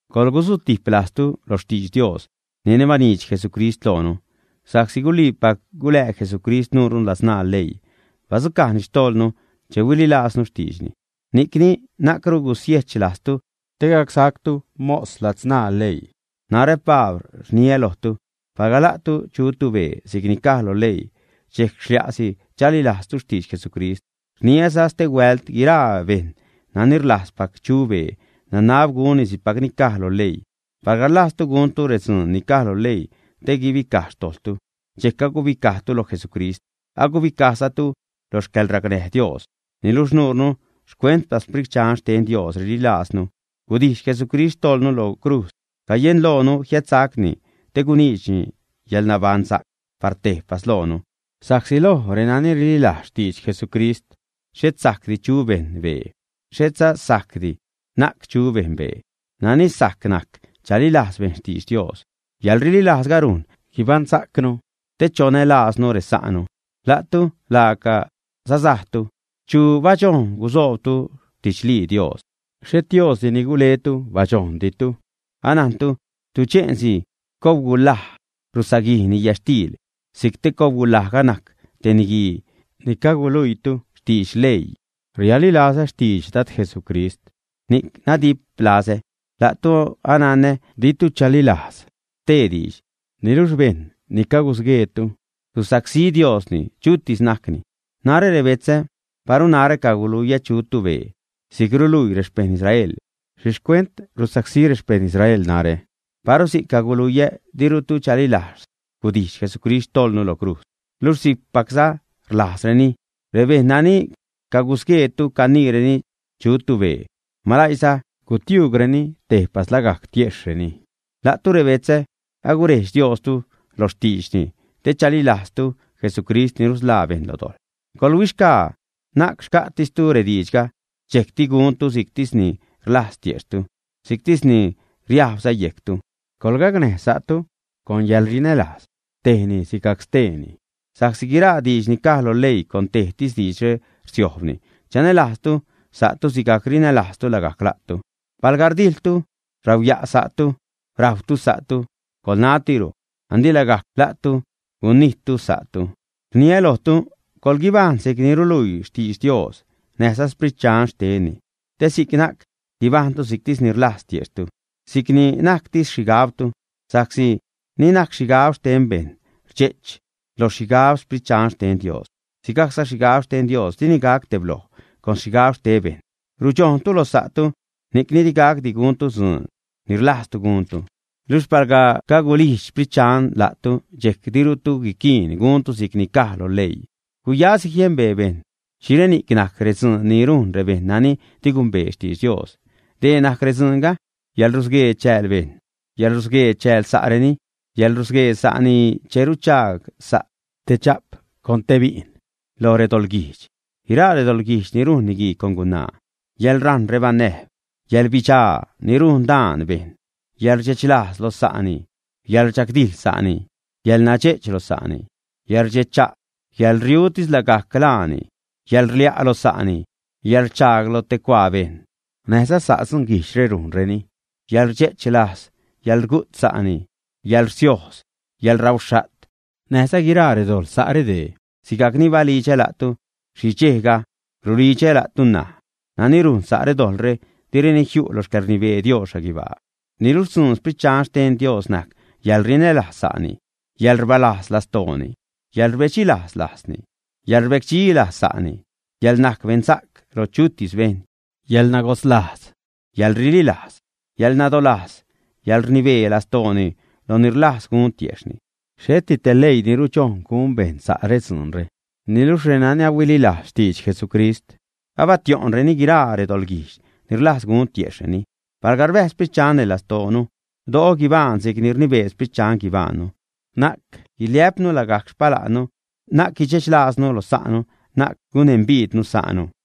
Coḻgusutijp lajztu lo xtidx Dios nani baniidx Jesucrist loonu sa'csi guliipac gulää Jesucrist nuure ladzṉaa leii, badzucajni xtojḻnu che huililajznu xtiidxni, ni'cni na'cru gusiejch lajztu te gacsactu mos ladzṉaa leii. Narä Pabl rniä lojtu, palga la'tu chutu bee si'cni caj lo leii, dxejc xlia'si chalilajztu xtidx Jesucrist. Rniäza stehuält, guiraa bejṉ nani rlajzpac chu bee, nanab gunni si'cpac ni caj lo leii. Palga rlajztu guntu redzuun ni caj lo leii te guibicaj xtojḻtu, dxejc agubicajtu lo Jesucrist, agubicajzatu lo xcäḻracnäj Dios. Niluxh nuure xcuentpac Sprit Dxan xten Dios rililajznu gudijx Jesucrist xtojḻnu lo crujz, cayenloonu jiädsacni te guniidxni yäḻbaṉsa'c par tejpas loonu. Sa'csi loj reni rililajz xtidx Jesucrist xhet sajcdi chu bejṉ bee, xhetza sajcdi na'c chu bejṉ bee, nani sajc najc chalilajz bejṉ xtidx Dios. Yäḻrililajzga rujn guibaṉsa'cnu te chonälajznu resa'nu. La'tu laaca sasajtu. ¿Chu badxojn gusoobtu xtidxlii Dios? Xhet Diosdi ni guletu badxojnditu. Anajntu tudxe'nsi cobgulaj rusaguijni yätxtiil; si'c te cobgulajga najc te niguii ni caguluiitu xtidx leii. Rialilazä xtidx Dad Jesucrist, ni'c nadiplazä la'tu; ananä ditu chalilajz stee diidx. Niluxh bejṉ ni cagusgueetu susacsí Diosni, chutis najcni. Narä rebetzä, paru narä caguluiä chutu bee, si'c ruluii rexpejṉ Israel, ¿xhi xcuent rusacsí rexpejṉ Israel narä? Paru si'c caguluiä, dirutu chalilajz gudijx Jesucrist xtojḻnu lo crujz. Luxh si'cpacza rlajzreni. Rebejṉ nani cagusgueetu caniireni chutu bee, ¡malaiiza gutiuugreni tejpas lagajc tiejxhreni! La'tu rebetzä, agurejdx Diostu loj xtiidxni te chalilajztu Jesucrist ni rusḻaa bejṉ lo dojḻ. Coḻhuixgaa na'c xca'tistu rediidxga dxejcti guntu si'ctis ni rlajz tiejxhtu, si'ctis ni riajbza yejctu. Coḻgacnäj sa'tu con yäḻrinälajz, tejni sigajc steeni. Sa'csi guiraa diidx ni caj lo leii con tejtis diidxre rsiojbni: “Chanälajztu sa'tu sigajc rinälajztu lagajc la'tu.” Palga rdijḻtu, rauya'tu sa'tu, rajwtu sa'tu, ¡coḻnatiro! Andi lagajc la'tu gunijttu sa'tu. Rniä lojtu, coḻguibajṉ si'c ruluii xtidx Dios näjza Sprit Dxan xtenni, te si'c na'c guibajṉtu si'ctis ni rlajz tiejxhtu, si'c ni najctis xhigabtu. Sa'csi ni najc xhigab xten bejṉ rdxe'ch loj xhigab Sprit Dxan xten Dios. Sigajcza xhigab xten Dios dini gac tebloj con xhigab xte bejṉ. Rudxojṉtu loj sa'tu, ni'cni digacdi guntu dzuun ni rlajztu guntu. Luxh palga cagulijdx Sprit Dxan la'tu, dxejc dirutu quiquiin guntu si'c ni caj lo leii. Guyasi jiembee bejṉ xhireni'c najc redzuun ni rujn rebejṉ nani di gumbee xtidx Dios. Dee najc redzuunga: yäḻrusguee chääl bejṉ, yäḻrusguee chääl sa'reni, yäḻrusguee sa'ni che ruchaag sa' te dxa'p con te bi'n loj redoḻguijdx, guiraa redoḻguijdx ni rujn niguii con gunaa, yäḻrajṉ rebanäjb, yäḻbidxaa ni rujn daan bejṉ, yäḻrdxechlajz loj sa'ni, yäḻrchagdijḻ sa'ni, yäḻnayedx lo sa'ni, yäḻrdxecha', yäḻriu lagajctis laani, yäḻrlia' lo sa'ni, yäḻrchaag lo te cuaa bejṉ. N̲ajza sa' dzunguijdxre rujnreni: yäḻrdxe'ch lajz, yäḻrugu't sa'ni, yäḻrsiojz, yäḻrauxha't, näjza guiraa dojḻ sa' redee. Sigajc ni balidxä la'tu xhi dxejga rulidxä la'tu ṉaj. Nani rujn sa' redojḻre direni jiu' loj xcäḻrnibee Dios xhaguibaa. Niluxh xtzuun Sprit Dxan xten Dios najc yäḻrinälajz sa'ni, yäḻrbalajz lastooni, yäḻrbedxi lajzni, yäḻrbecdxi lajz sa'ni, yäḻnajc beṉsa'c lo chutis bejṉ, yäḻnagodzlajz, yäḻrililajz, yäḻnadolajz, yäḻrnibee lastooni lo ni rlajz gun tiejxhni. Xheti te leii ni rudxojn gun bejṉ sa' redzuunre. Niluxh renani ahuililajz xtidx Jesucrist, abatio'ṉreni guiraa redoḻguijdx ni rlajz gun tiejxhreni. Palga rbäjz Sprit Dxan neṉ lastoonu, do'o guibajṉ si'c rnibee Sprit Dxan guibajṉnu. Na'c guiliä'pnu lagajc xpala'nnu, na'c guidxech lajznu lo sa'nu, na'c gunembiidnu sa'nu.